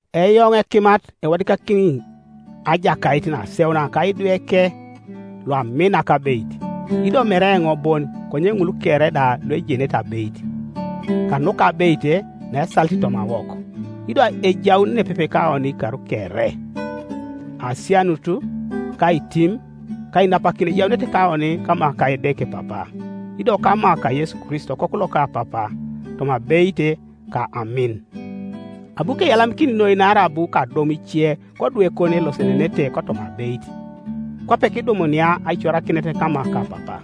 Eoŋ ekimat ewadikakini ajakait naseuna ka idweke, luamina kabeit, ido mere eoŋ bon konye ŋul kere da luejenete abeit, kanuka abeit naesalit tomawok, ido ejaun nepepe kaoni ikar kere: Asianut, ka aitim, ka ainapakin ejaunete kaoni kama ka Edeke Papa, ido kama ka Yesu Kristo Okoku loka Papa, toma abeit ka amin. Abu keyalamikin noi naarai abu kadum ice kodwekon elosenenete kotoma abeit, kwape kidumunia aicorakinet kama ka Papa.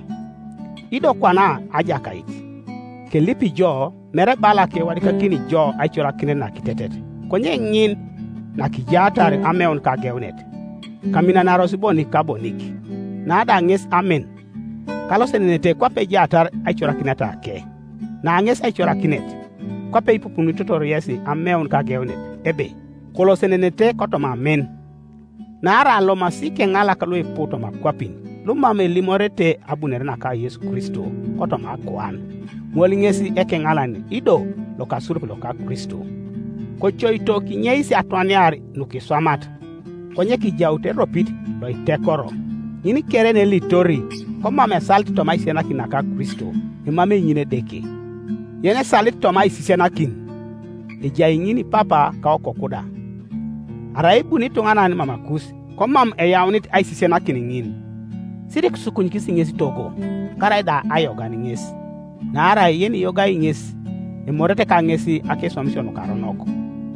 Ido kwana ajakait, kelipi jo, mere bala kewadikakini jo aicorakinet nakitetet, konye ŋin nakijaatar ameun kageunet, kaminanaros bonik ka bonik. Na da ŋes amin, kalosenenete kwape ejaatar aicorakinetake; na ŋes aicorakinet, kwape ipupunitotor yesi ameun kageunet, ebe, kolosenenete kotoma amin. Naarai alomasi ikeŋalak luipu toma akwapin, lumam elimorete abunore naka Yesu Kristo kotoma akuan; ŋol ŋes ekeŋalan ido lokasurup loka Kristo. Kocoito kinyeis atwaniar nukiswamat, konye kijaut eropit loitekoro. Ŋin kere yenelitori komam esalit toma aisisianakin naka Kristo, emamei ŋin Edeke; yenesalit toma aisisianakin, ejai ŋin Papa ka Okoku da. Arai ebuni ituŋanan mamakus, komam eyaunit aisisianakin ŋin, sirikisukunyikis ŋes togo, karaida ayogan ŋes; naarai yeniyogai ŋes emorete kaŋes akeswamisio nukaronok.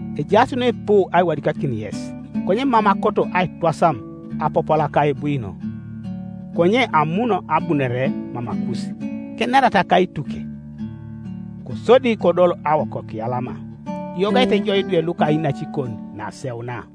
Ejaas nuipu aiwadikakin yes, konye mam akoto aitwasam apapula ka ebwino, konye amun abunore mamakus, kenerata kaituke, kosodi kodol awokokiyalama. Kiyogaete jo idwe luka inacikon naseuna.